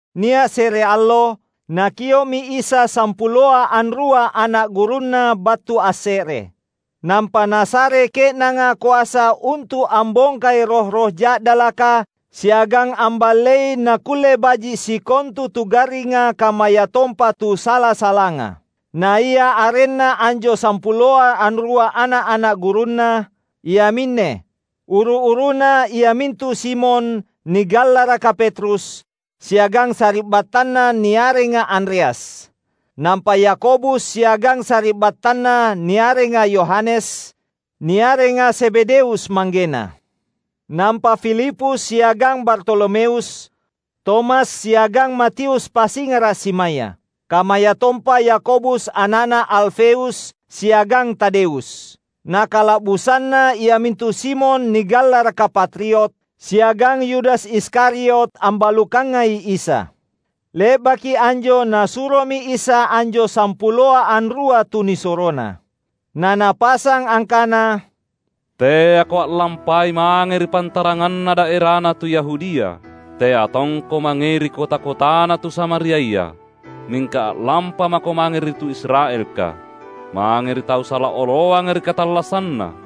Nia’ se’re allo, Nakio’mi Isa sampuloa anrua ana’ gurunNa battu asse’re. Nampa Nasare ke’nanga koasa untu’ ambongkai roh-roh ja’dalaka siagang amballei nakkulle baji’ sikontu tu garringa kammayatompa tu sala-salanga. Naia arenna anjo sampuloa anrua ana’-ana’ gurunNa, iaminne: uru-uruna iamintu Simon (nigallaraka Petrus) siagang sari’battanna niarenga Andreas; nampa Yakobus siagang sari’battanna niarenga Yohanes, niarenga Zebedeus manggena. Nampa Filipus siagang Bartolomeus, Tomas siagang Matius pasingara’ simaya; kammayatompa Yakobus ana’na Alfeus, siagang Tadeus; na kala’busanna iamintu Simon nigallaraka Patriot, siagang Yudas Iskariot ambalukangai Isa. Le’baki anjo Nasuromi Isa anjo sampuloa anrua tu nisuroNa. Na Napasang angkana, "Teako a’lampai mange ri pantaranganna daerana tu Yahudia. Tea tongko mangei ri kota-kotana tu Samariaya. Mingka a’lampamako mange ri tu Israelka, mange ri tau sala oloanga ri katallassanna.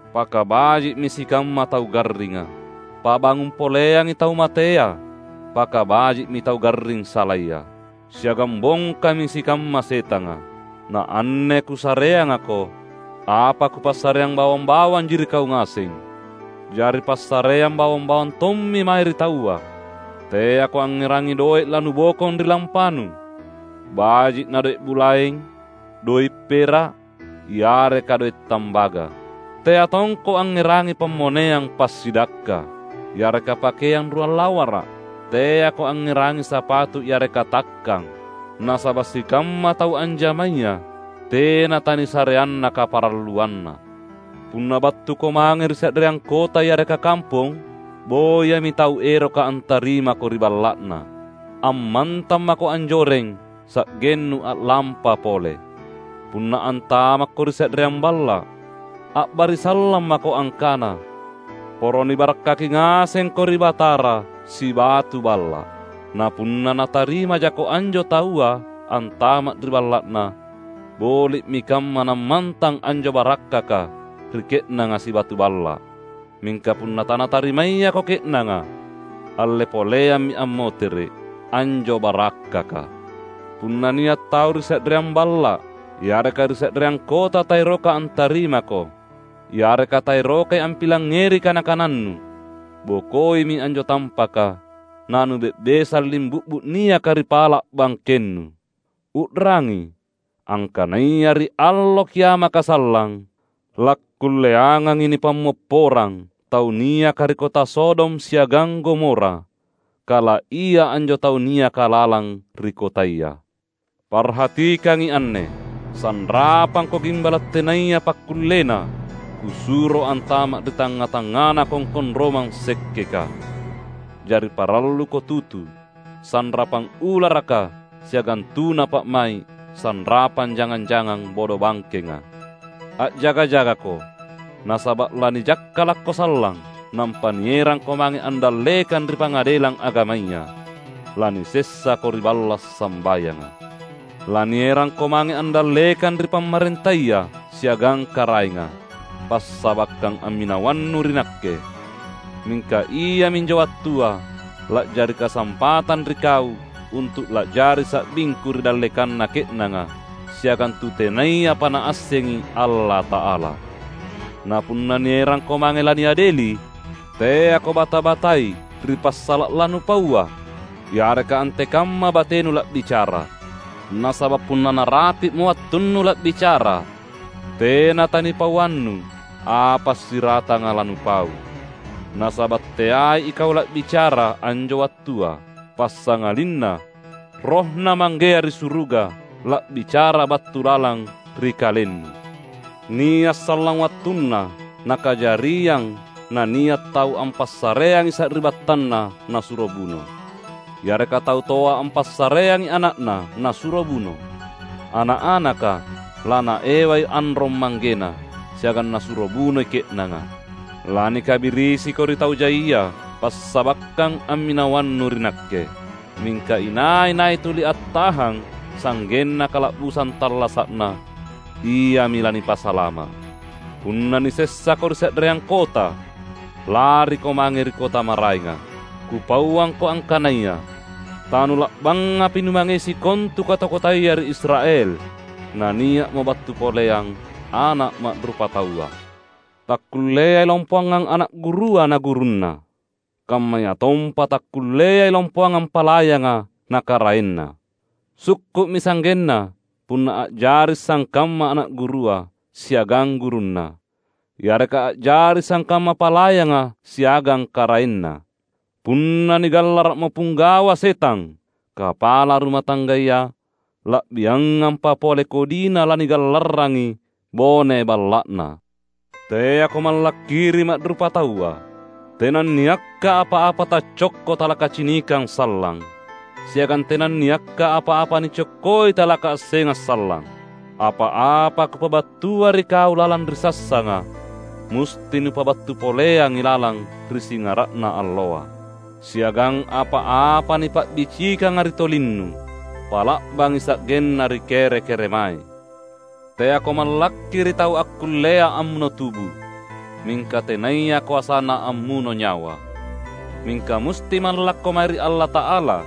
Pakabaji’mi sikamma tau garringa; pabangung poleangi tau matea pakabaji’mi tau garring salaya, siagang bongkami sikamma setanga. Na anne Kusareangako, apa kupassareang bawang-bawanji ri kau ngaseng. Jari passareang bawang-bawang tommi mae ri taua. Teako angngerangi doe’ lanubokong ri lampanu, baji’ na doe’ bulaeng, doe’ pera’, yareka doe’ tambaga. Tea tongko angngerangi pammoneang passidakka, yareka pakeang ruang lawara’, teako angngerangi sapatu yareka takkang. Nasaba’ sikamma tau anjamaya tena tanisareanna kaparalluanna. Punna battuko mange ri se’reang kota yareka kampong, boyami tau eroka antarimako ri balla’na. Ammantang mako anjoreng sa’gennu a’lampa pole. Punna antamakko ri se’reang balla’, a’barisallang mako angkana, ‘Poro nibarakkaki ngasengko ri Batara sibatu balla’.’ Na punna natarimajako anjo taua antama’ ri balla’na, boli’mi kamma nammantang anjo barakkaka ri ke’nanga sibatu balla’. Mingka punna tanatarimayako ke’nanga, alle poleammi ammotere’ anjo barakkaka. Punna nia’ tau ri se’reang balla’ yareka ri se’reang kota taeroka antarimako, yareka taerokai ampilangngeri kana-kanannu, bokoimi anjo tampaka na nube’besang limbu’bu’ niaka ri pala’ bangkennu. U’rangi! Angkanaya ri Allo Kiamaka sallang, lakkulleangangi nipammopporang tau niaka ri kota Sodom siagang Gomora, kala ia anjo tau niaka lalang ri kotaya!" "Parhatikangi anne: Sanrapangko gimbala’ tenaya pakkullena Kusuro antama’ ri tangnga-tangngana kongkong romang sekkeka. Jari paralluko tutu sanrapang ularaka siagang tuna pa’mai’ sanrapang jangang-jangang bodobangkenga. A’jaga-jagako, nasaba’ lanijakkalakko sallang nampa nierangko mange andallekang ri pangadelang agamaya. Lanisessako ri balla’ sambayanga. Lanierangko mange andallekang ri pamarentaya siagang karaenga, passabakkang amminawannu ri Nakke. Mingka iaminjo wattua la’jari kasampatang ri kau untu’ la’jari sa’bingKu ri dallekanna ke’nanga siagang tu tenayapa naassengi Allata’ala. Na punna nierangko mange laniadeli, teako bata-batai ri passala’ lanupaua yareka antekamma batenu la’bicara. Nasaba’ punna narapi’mo wattunnu la’bicara tena tanipauannu apa siratanga lanupau. Nasaba’ teai ikau la’bicara anjo wattua, passangalinna RohNa Manggea ri suruga la’bicara battu lalang ri kalennu. Nia’ sallang wattunna nakajariang nania’ tau ampassareangi sari’battanna nasuro buno; yareka tau toa ampassareangi ana’na nasuro buno. Ana’-anaka lanaewai anrong manggena, siagang nasuro bunoi ke’nanga. Lanikabirisiko ri tau jaia passabakkang amminawannu ri Nakke. Mingka inai-nai tuli attahang sa’genna kala’busang tallasa’na, iami lanipasalama’. Punna nisessako ri se’reang kota, lariko mange ri kota maraenga. Kupauangko angkanaya: Tanula’bangapi numangei sikontu kota-kotaya ri Israel, nania’mo battu poleang Ana’ Ma’rupataua. Takkulleai lompoangang ana’ gurua na gurunna; kammayatompa takkulleai lompoangang palayanga na karaenna. Sukku’mi sa’genna punna a’jari sangkamma ana’ gurua siagang gurunna; yareka a’jari sangkamma palayanga siagang karaenna. Punna nigallara’mo Pinggawa setang kapala ruma tanggaya, la’biangampa pole kodina lanigallarrangi bone balla’na!" "Teako mallakki ri ma’rupataua. Tenanniakka apa-apa taccokko talakacinikang sallang; siagang tenanniakka apa-apa nicokkoi talakaassengang sallang. Apa-apa Kupabattua ri kau lalang ri sassanga, musti nupabattu poleangi lalang ri singara’na alloa. Siagang apa-apa nipa’bicikanga ri tolinnu, pa’la’bangi sa’genna ri kere-keremae! Teako mallakki ri tau akkullea ammuno tubu, mingka tenaya koasaNa ammuno nyawa. Mingka musti mallakko mae ri Allata’ala,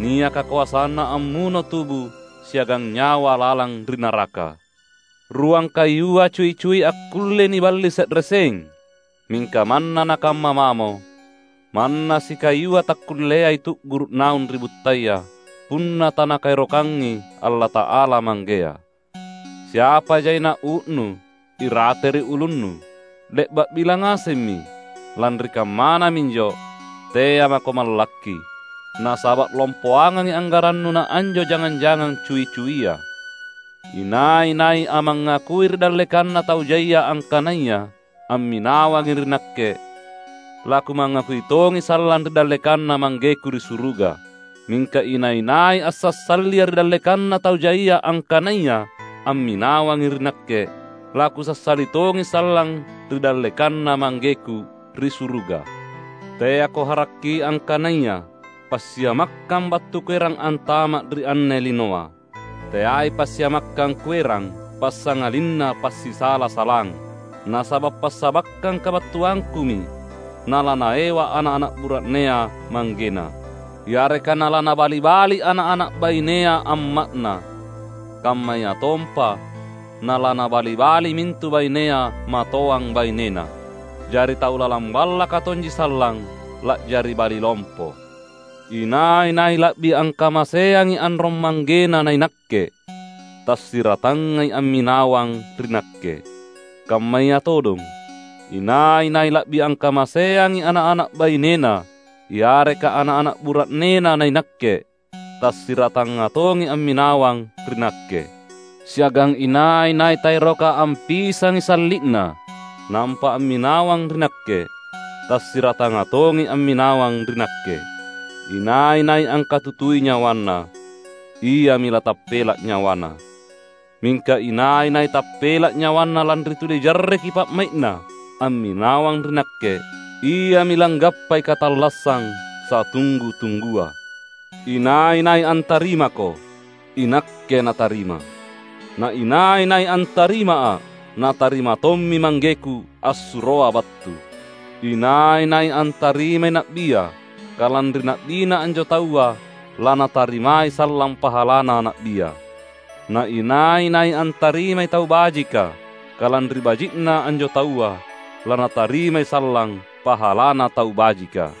niaka koasana ammuno tubu siagang nyawa lalang ri naraka. Ruang kayua cui-cui akkullei niballi se’re seng. Mingka manna nakamma mamo, manna sikayua takkulleai tu’guru’ naung ri buttaya punna taNakaerokangi Allata’ala Manggea. Siapa jaina uu’nu irate ri ulunnu, le’ba’ bilang ngasemmi. Lanri kammana minjo, tea’ mako mallakki! Nasaba’ lompoangangi anggarannu naanjo jangang-jangang cui-cuia!" "Inai-nai ammangakui ri dallekanna tau jaia angkanaya amminawangi ri Nakke, laKumangakui tongi sallang ri dallekanNa ManggeKu ri suruga. Mingka inai-nai ansassaliA’ ri dallekanna tau jaia angkanaya amminawangi ri Nakke, laKusassali tongi sallang ri dallekanNa ManggeKu ri suruga." "Teako harakki angkanaya passiamakkang battu Kuerang antama’ ri anne linoa. Teai passiamakkang Kuerang, passangalinna passisala-salang. Nasaba’ passabakkang kabattuangKumi nalanaewa ana’-ana’ bura’nea manggena; yareka nalanabali-bali ana’-ana’ bainea amma’na; kammayatompa nalanabali-bali mintu bainea matoang bainena. Jari tau lalang ballaka tonji sallang la’jari bali lompo. Inai-nai la’bi angkamaseangi anrong manggena naiNakke, tasiratangai amminawang ri Nakke. Kammaya todong, inai-nai la’bi angkamaseangi ana’-ana’ bainena yareka ana’-ana’ bura’nena naiNakke, tasiratanga tongi amminawang ri Nakke. Siagang inai-nai taeroka ampisangi salli’na nampa amminawang ri Nakke, tasiratanga tongi amminawang ri Nakke. Inai-nai angkatutui nyawana, iami latappela’ nyawana; mingka inai-nai tappela’ nyawana lanri tuli jarreki pa’mai’na amminawang ri Nakke, iami langgappai katallassang satunggu-tunggua." "Inai-nai antarimako, iNakke natarima. Na inai-nai antarimA’, natarima tommi ManggeKu assuroA’ battu. Inai-nai antarimai na’bia kalanri na’bina anjo taua lanatarimai sallang pahalana na’bia. Na inai-nai antarimai tau bajika kalanri baji’na anjo taua, lanatarimai sallang pahalana tau bajika.